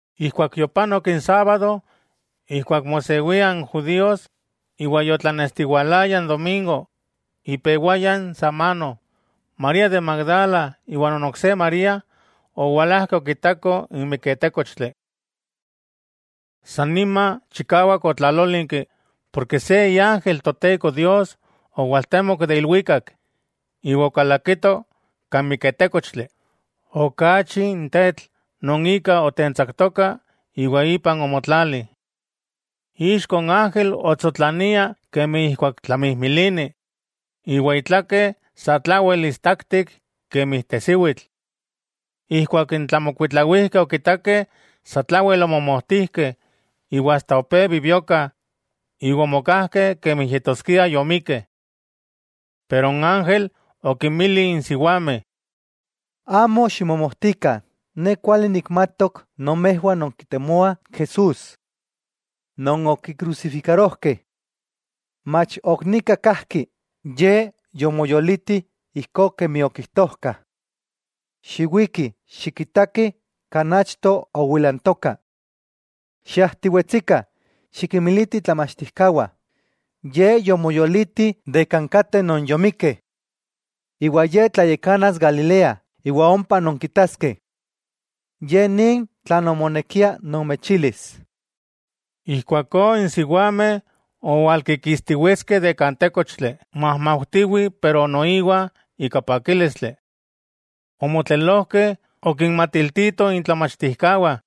Ijkuak yopanok n sábado ijkuak mosewia n judíos, iwa yotlanestiwalaya n domingo, ipewaya n samano, María de Magdala iwa non ok se María owalajkeh okitakoh n miketékochtli. Sannima chikawak otlalólinki, porke se iángel Toteko Dios owaltemok de ilwikak, iwa okalakito kan miketékochtli, okaachi n tetl non ika otentsaktoka iwa ipan omotlali. Ixko n ángel otsotlania kemi ijkuak tlamijmilini, iwa itlake satlawel istaktik kemi tesiwitl. Ijkuak n tlamokuitlawijkeh okitakeh, sa tlawel omomojtijkeh iwa asta opé bibiokah iwa omokajkeh kemi yetoskia yomikkeh. Pero n ángel okinmili n siwameh: —Amo ximomojtikah. Ne kuali nikmatok nomejwah nonkitemoah Jesús, non okikrusifikarojkeh. Mach ok nika kajki, Ye yomoyoliti ijkó kemi okijtojka. Xiwikih, xikitakih kan achto owilantoka. Xiajtiwetsikah, xikinmilitih itlamachtijkawah Ye yomoyoliti de kan kateh non yomikkeh. Iwa Ye tlayakanas Galilea iwa ompa nonkitaskeh. Ye nin tlan omonekia nomechilis. Ijkuakó n siwameh owalkikistiwetskeh de kan tékochtli, majmaujtiwih pero noiwa ika pakílistli. Omotlelojkeh okinmatiltitoh itlamachtijkawah.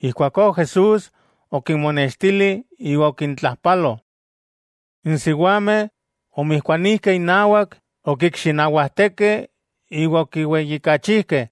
Ijkuakó Jesús okinmonextili iwa okintlajpalo. N siwameh omijkuanijkeh inawak, okikxinawajtekeh iwa okiweyijkachikeh.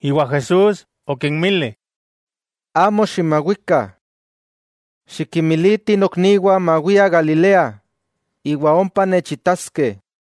Iwa Jesús okinmili: —Amo ximawikah. Xikinmilitih nokniwah mawiah Galilea, iwa ompa nechitaskeh.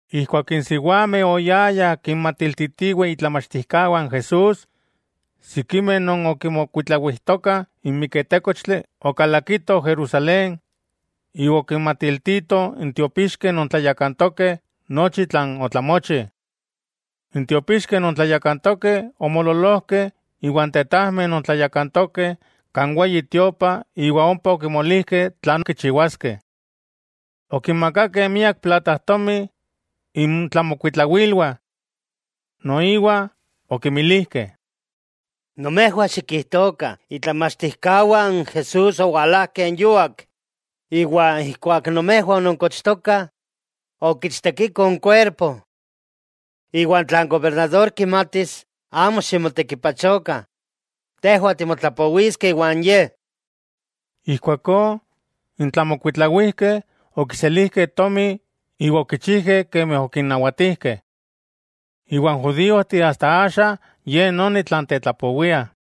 Ijkuak n siwameh oyayah kinmatiltitiweh itlamachtijkawah n Jesús, sikimeh non okimokuitlawijtokah n miketékochtli, okalakitoh Jerusalén iwa okinmatiltitoh n tiopixkeh non tlayakantokeh nochi tlan otlamochi. N tiopixkeh non tlayakantokeh omoololojkeh iwa n tetajmeh non tlayakantokeh kan Weyi Tiopa iwa ompa okimolijkeh tlan kichiwaskeh. Okinmakakeh miak platajtomi intlamokuitlawilwah. Noiwa okinmilijkeh: —Nomejwah xikijtokah itlamachtijkawah n Jesús owalajkeh yuak, iwa ijkuak nomejwah ononkochtokah, okichtekikoh n kuerpo. Iwa tla n gobernador kimatis, amo ximotekipachokah, tejwah timotlapowiskeh iwan ye. Ijkuakó n tlamokuitlawijkeh okiselijkeh tomi iwa okichijkeh kemi okinnawatijkeh. Iwa n judíojteh asta axa ye noni tlan tetlapowiah.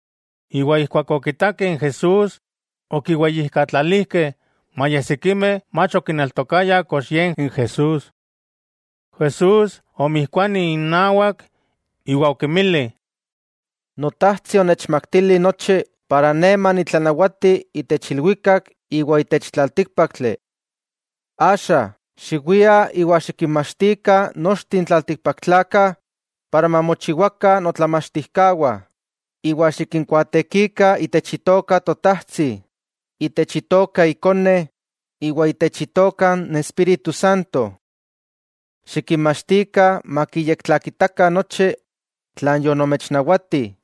Iwa ijkuak okitakeh n Jesús, okiweyijkatlalijkeh, maya sikimeh mach okineltokayah kox Ye n Jesús. Jesús omijkuani innawak iwa okinmili: —Notajtsi onechmaktili nochi para Ne manitlanawati itech ilwikak iwa itech tlaltíkpaktli. Axa, xiwiah iwa xikinmachtikah nochteh n tlaltikpaktlakah para mamochiwakah notlamachtijkawah, iwa xikinkuaatekikah itech itoka Totajtsi, itech itoka Ikone, iwa itech itoka n Espíritu Santo. Xikinmachtikah makiyektlakitakah nochi tlan yonomechnawati,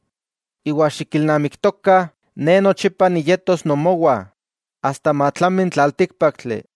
iwa xikilnamiktokah Ne nochipa niyetos nomowah, asta matlami n tlaltíkpaktli.